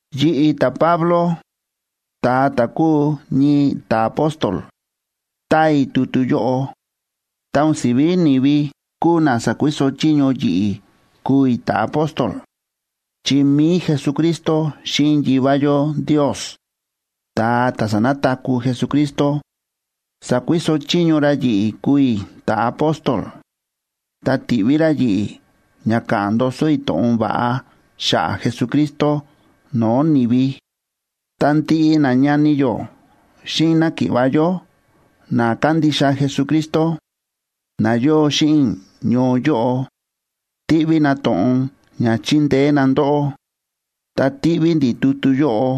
Yi̱ꞌi̱, ta̱Pablo, ta̱a ta̱ kúu ñii ta̱apóstol, táa i̱ tutu yóꞌo. Ta o̱n si̱ví ni̱vi kúu na sa̱kuiso chiño yi̱ꞌi̱ kuu i̱ ta̱apóstol, chi mi̱i Jesucristo xíꞌin Yivá yó Ndios, ta̱a ta̱ sa̱nataku̱ Jesucristo, sa̱kuiso chiño ra yi̱ꞌi̱ kuu i̱ ta̱apóstol, ta ti̱ꞌví ra yi̱ꞌi̱ ña ka̱ꞌa̱n ndoso i̱ to̱ꞌon va̱ꞌa xa̱ꞌa̱ Jesucristo no̱o̱ ni̱vi. Ta ndiꞌi nañani yó xíꞌin náki̱ꞌva̱ yó na kándixa Jesucristo, na yóo xíꞌin i̱ ñoo yóꞌo, tíꞌví na to̱ꞌon ña chindeé na ndóꞌó. Ta tíꞌví ndi̱ tutu yóꞌo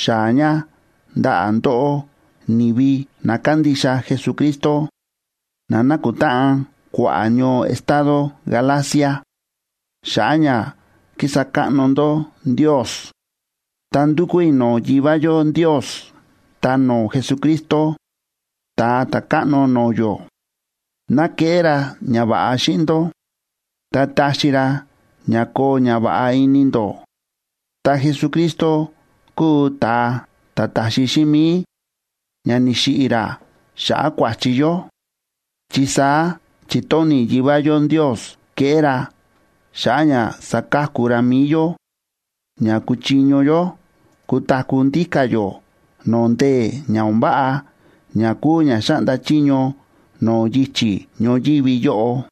xaa̱ ña ndaꞌa̱ ndóꞌó ni̱vi na kándixa Jesucristo, na nákutáꞌan kua̱ꞌa̱ ñoo estado Galacia xa̱ꞌa̱ ña kísa káꞌno ndó Ndios. Ta ndúkú i̱ no̱o̱ Yivá yó Ndios ta no̱o̱ Jesucristo, Ta̱a Ta̱káꞌno no̱o̱ yó, ná keꞌé ra ñava̱ꞌa xíꞌin ndó, ta taxi ra ña koo ñava̱ꞌa ini ndó. Ta Jesucristo kúu ta̱a ta̱ ta̱xi xíꞌin mi̱i, ña ni̱xiꞌi̱ ra xa̱ꞌa̱ kua̱chi yó, chi saá chi̱tóni̱ Yivá yó Ndios keꞌé ra xa̱ꞌa̱ ña sa̱ka̱ku ra mi̱i yó ña kuchiño yó kutaku̱ ndíka̱ yó no̱o̱ ndee̱ o̱n váꞌa ña kúu ña xáꞌnda chiño no̱o̱ yichi̱ ñoyívi yóꞌo.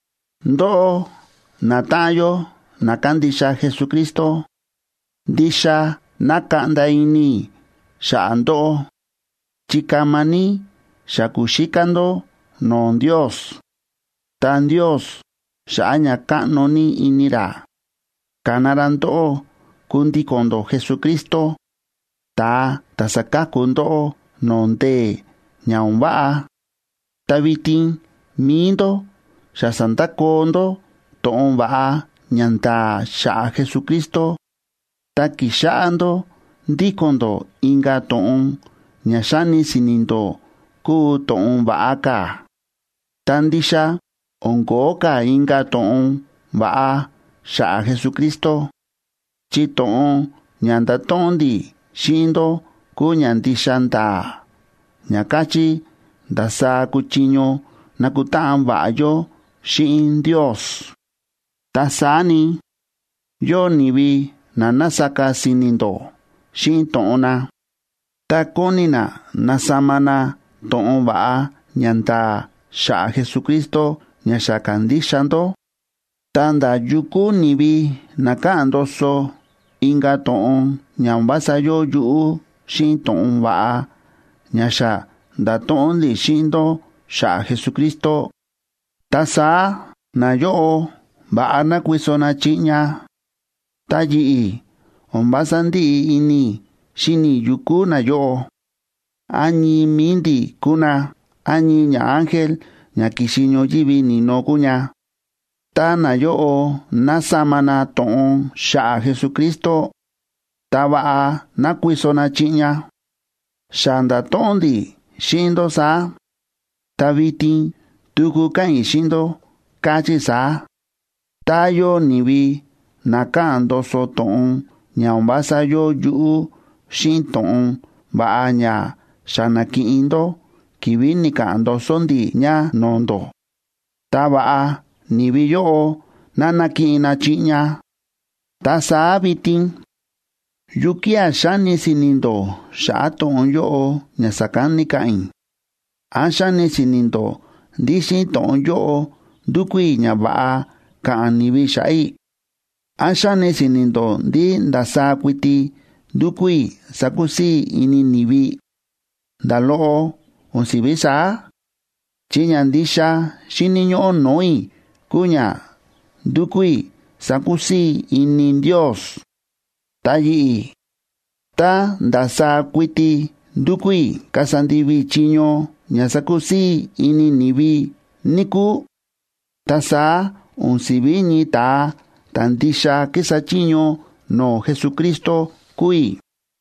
Ndóꞌó, natáꞌan yó na kándixa Jesucristo, ndixa nákaꞌnda ini i̱ xa̱ꞌa̱ ndóꞌó, chi kama ní xa ku̱xíká ndó no̱o̱ Ndios. Ta Ndios, xa̱ꞌa̱ ña káꞌno ní ini ra, ka̱na ra ndóꞌó kundíko̱n ndó Jesucristo, ta̱a ta̱ sa̱ka̱ku ndóꞌó no̱o̱ ndee̱ ña o̱n váꞌa. Ta vitin mi̱i ndó xa sa̱ndakoo ndó to̱ꞌon va̱ꞌa ña nda̱a̱ xa̱ꞌa̱ Jesucristo, ta kíxáꞌá ndó ndíko̱n ndó inka̱ to̱ꞌon ña xáni si̱ni̱ ndó kúu to̱ꞌon va̱ꞌa ka̱. Ta ndixa o̱n ko̱ó ka̱ inka̱ to̱ꞌon va̱ꞌa xa̱ꞌa̱ Jesucristo, chi to̱ꞌon ña nda̱to̱ꞌon ndi̱ xíꞌin ndó kúu ña ndixa nda̱a̱ ña káchí ndasaá kuchiño nakutáꞌan va̱ꞌa yó xíꞌin Ndios. Ta saá ni, yóo ni̱vi na násaka si̱ni̱ ndó xíꞌin to̱ꞌon na, ta kóni na nasama na to̱ꞌon va̱ꞌa ña nda̱a̱ xa̱ꞌa̱ Jesucristo ña xa ka̱ndixa ndó. Ta ndá yu kúu ni̱vi na káꞌa̱n ndoso inka̱ to̱ꞌon ña o̱n vása yóo yuꞌú xíꞌin to̱ꞌon va̱ꞌa ña xa nda̱to̱ꞌon ndi̱ xíꞌin ndó xa̱ꞌa̱ Jesucristo, ta saá nayóꞌo va̱ꞌa ná kuiso na chiꞌña. Ta yi̱ꞌi̱, o̱n vása ndíꞌi ini i̱ xíni i̱ yu kúu nayóꞌo, án ñii mi̱i ndi̱ kúu na, án ñii ñaángel ña ki̱xi ñoyívi ni̱no kúu ña, tá nayóꞌo nasama na to̱ꞌon xa̱ꞌa̱ Jesucristo, ta va̱ꞌa ná kuiso na chiꞌña. Xa nda̱to̱ꞌon ndi̱ xíꞌin ndó saá, ta vitin tuku káꞌa̱n i̱ xíꞌin ndó, káchí i̱ saá: Tá yóo ni̱vi na káꞌa̱n ndoso to̱ꞌon ña o̱n vása yóo yuꞌú xíꞌin to̱ꞌon va̱ꞌa ña xa na̱kiꞌin ndó ki̱vi̱ ni̱ka̱ꞌa̱n ndoso ndi̱ ña no̱o̱ ndó, ta va̱ꞌa ni̱vi yóꞌo ná nakiꞌin na chiꞌña. Ta saá vitin, ¿yukía̱ xáni si̱ni̱ ndó xa̱ꞌa̱ to̱ꞌon yóꞌo ña sa̱kán ni̱ka̱ꞌa̱n i̱? ¿Án xáni si̱ni̱ ndó ndí xíꞌin to̱ꞌon yóꞌo ndúkú i̱ ña va̱ꞌa ka̱ꞌa̱n ni̱vi xa̱ꞌa̱ i̱? ¿Án xáni si̱ni̱ ndó ndí ndasaá kuiti ndúkú i̱ sakusii̱ i̱ ini ni̱vi? Nda̱ loꞌo o̱n si̱ví saá, chi ña ndixa xíni̱ ñóꞌó no̱o̱ i̱ kúu ña ndukú i̱ sakusii̱ i̱ ini Ndios. Ta yi̱ꞌi̱, tá ndasaá kuiti ndúkú i̱ kasa ndivi i̱ chiño ña sakusii̱ i̱ ini ni̱vi, níkúu, ta saá o̱n si̱ví ñii ta̱a ta̱ ndixa kísa chiño no̱o̱ Jesucristo kúu i̱.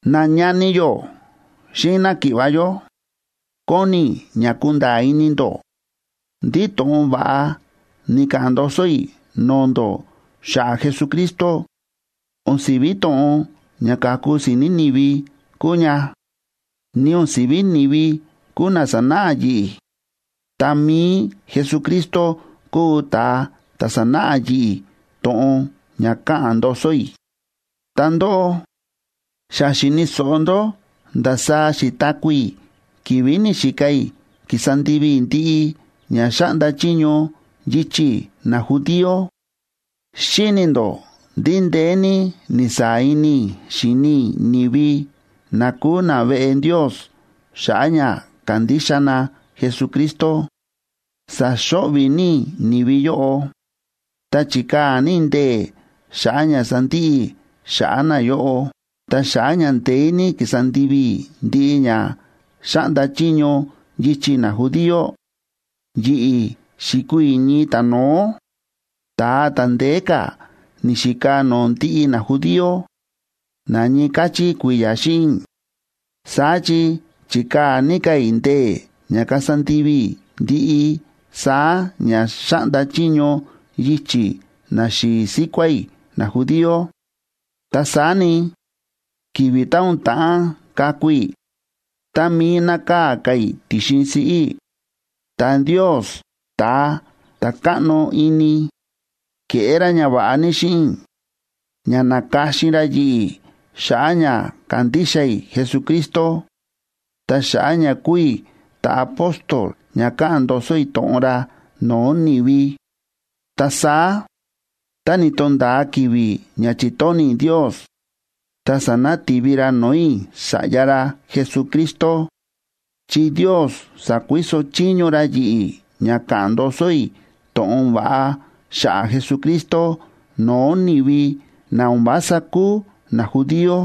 Nañani yó xíꞌin náki̱ꞌva̱ yó, kóni i̱ ña kunda̱a̱ ini ndó ndí to̱ꞌon va̱ꞌa ni̱ka̱ꞌa̱n ndoso i̱ no̱o̱ ndó xa̱ꞌa̱ Jesucristo o̱n si̱ví to̱ꞌon ña ka̱ku si̱ni̱ ni̱vi kúu ña. Ni o̱n si̱ví ni̱vi kúu na sa̱náꞌa yi̱ꞌi̱, ta mi̱i Jesucristo kúu ta̱a ta̱ sa̱náꞌa yi̱ꞌi̱ to̱ꞌon ña káꞌa̱n ndoso i̱. Ta ndóꞌó, xa xi̱ni̱ so̱ꞌo ndó ndasaá xi̱taku̱ i̱ ki̱vi̱ ni̱xika i̱ kísa ndivi i̱ ndiꞌi ña xáꞌnda chiño yichi̱ najudío. Xíni̱ ndó ndí ndeé ní ni̱saa̱ ini i̱ xi̱ni i̱ ni̱vi na kúu naveꞌe Ndios xa̱ꞌa̱ ña kándixa na Jesucristo. Sa̱xo̱ꞌvi̱ ní i̱ ni̱vi yóꞌo, ta chi̱kaa̱ ní i̱ ndee̱ xa̱ꞌa̱ ña sandiꞌi i̱ xa̱ꞌa̱ nayóꞌo. Ta xa̱ꞌa̱ ña ndeé ní ki̱sa ndivi i̱ ndiꞌi ña xáꞌnda chiño yichi̱ najudío, yi̱ꞌi̱ xi̱kuu i̱ ñii ta̱no̱ó, ta̱a ta̱ ndeé ka̱ ni̱xika no̱o̱ ndiꞌi najudío na ñii káchí kui̱ya̱ xíꞌin i̱. Saá chi chi̱kaa̱ ní ka̱ i̱ ndee̱ ña kasa ndivi i̱ ndiꞌi saá ña xáꞌnda chiño yichi̱ naxi̱i̱ síkuá i̱ najudío. Ta saá ni, ki̱vi̱ tá o̱n ta̱ꞌán kaku i̱, tá mií nákaa̱ ka̱ i̱ ti̱xin siꞌí i̱, ta Ndios, ta̱a ta̱ káꞌno ini, ke̱ꞌé ra ñava̱ꞌa ní xíꞌin i̱ ña na̱ka̱xin ra yi̱ꞌi̱ xa̱ꞌa̱ ña kandixa i̱ Jesucristo, ta xa̱ꞌa̱ ña kuu i̱ ta̱apóstol ña ka̱ꞌa̱n ndoso i̱ to̱ꞌon ra no̱o̱ ni̱vi. Ta saá tá ni̱to̱nda̱a ki̱vi̱ ña chi̱tóni̱ Ndios, ta sa̱nati̱vi ra no̱o̱ i̱ Sa̱ꞌya ra Jesucristo, chi Ndios sa̱kuiso chiño ra yi̱ꞌi̱ ña ka̱ꞌa̱n ndoso i̱ to̱ꞌon va̱ꞌa xa̱ꞌa̱ Jesucristo no̱o̱ ni̱vi na o̱n vása kúu najudío.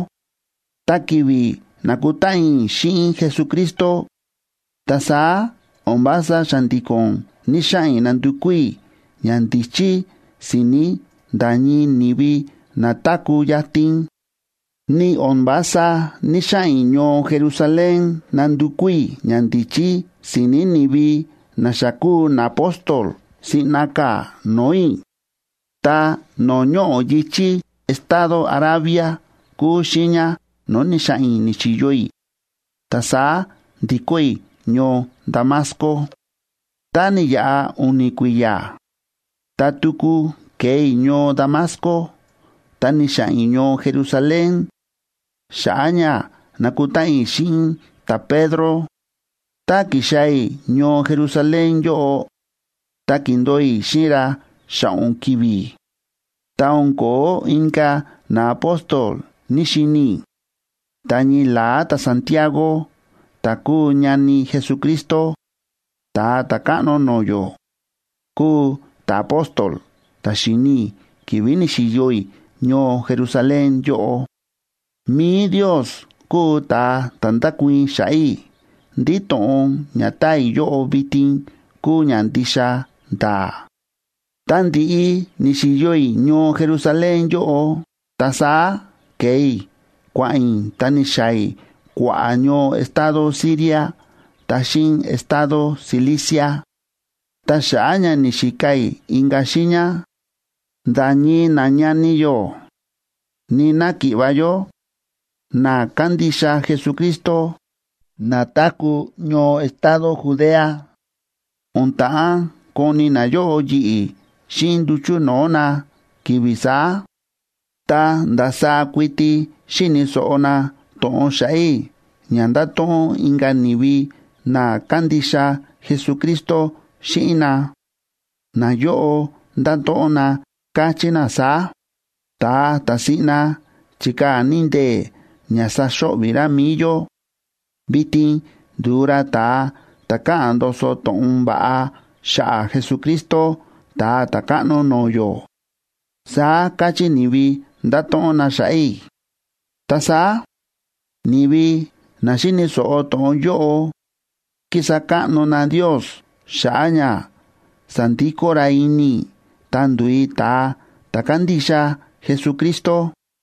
Ta ki̱vi̱ na̱kutáꞌan i̱ xíꞌin Jesucristo, ta saá o̱n vása xa̱ndi̱ko̱n ni̱‑xaꞌa̱n i̱ nandukú i̱ ñandíchí si̱ni̱ nda̱ ñii ni̱vi na táku̱ yatin, ni o̱n vása ní‑xaꞌa̱n i̱ ñoo Jerusalén nandukú i̱ ñandíchí si̱ni̱ ni̱vi na xa kúu naapóstol siꞌna ka̱ no̱o̱ i̱. Ta no̱o̱ ñoꞌo̱ yi̱chí estado Arabia kúu xiiña no̱o̱ ni̱xa̱ꞌa̱n i̱ ni̱xi̱yo i̱, ta saá ndi̱kó i̱ ñoo Damasco. Tá ni̱yaꞌa u̱ni̱ kui̱ya̱, ta tuku ke̱e i̱ ñoo Damasco, ta ni̱xa̱ꞌa̱n i̱ ñoo Jerusalén xa̱ꞌa̱ ña nakutáꞌan i̱ xíꞌin ta̱Pedro. Tá ki̱xaa̱ i̱ ñoo Jerusalén yóꞌo, ta ki̱ndo̱o i̱ xíꞌin ra xa̱ꞌo̱n ki̱vi̱. Ta o̱n ko̱ó inka̱ naapóstol ní‑xini i̱, ta ñii la̱á ta̱Santiagoa ta̱ kúu ñani Jesucristo, Ta̱a Ta̱káꞌno no̱o̱ yó, kúu ta̱apóstol ta̱ xi̱ni i̱ ki̱vi̱ ni̱xi̱yo i̱ ñoo Jerusalén yóꞌo. Mi̱i Ndios kúu ta̱a ta̱ ndákuii̱n xa̱ꞌa̱ i̱ ndí to̱ꞌon ña táa i̱ yóꞌo vitin kúu ña ndixa nda̱a̱. Ta ndi̱ꞌi ni̱xi̱yo i̱ ñoo Jerusalén yóꞌo, ta saá ke̱e i̱ kua̱ꞌa̱n i̱ ta ni̱xaa̱ i̱ kua̱ꞌa̱ ñoo estado Siria ta xíꞌin estado Cilicia. Ta xa̱ꞌa̱ ña ni̱xika i̱ inka̱ xiiña, nda̱ ñii nañani yó ni náki̱ꞌva̱ yó na kándixa Jesucristo na táku̱ ñoo estado Judea, o̱n ta̱ꞌán koni nayóꞌo yi̱ꞌi̱ xíꞌin nduchu̱ no̱o̱ na ki̱vi̱ saá, ta ndasaá kuiti xi̱ni̱ so̱ꞌo na to̱ꞌon xa̱ꞌa̱ i̱ ña nda̱to̱ꞌon inka̱ ni̱vi na kándixa Jesucristo xíꞌin na. Nayóꞌo nda̱to̱ꞌon na, káchí na saá: “Ta̱a ta̱ siꞌna chi̱kaa̱ ní ndee̱ ña sa̱xo̱ꞌvi̱ ra mi̱i yó, vitin ndu̱u ra ta̱a ta̱ káꞌa̱n ndoso to̱ꞌon va̱ꞌa xa̱ꞌa̱ Jesucristo, Ta̱a Ta̱káꞌno no̱o̱ yó”, saá káchí ni̱vi nda̱to̱ꞌon na xa̱ꞌa̱ i̱. Ta saá ni̱vi na xi̱ni̱ so̱ꞌo to̱ꞌon yóꞌo ki̱sa káꞌno na Ndios xa̱ꞌa̱ ña sa̱ndikó ra ini i̱ ta ndu̱u i̱ ta̱a ta̱ kándixa Jesucristo.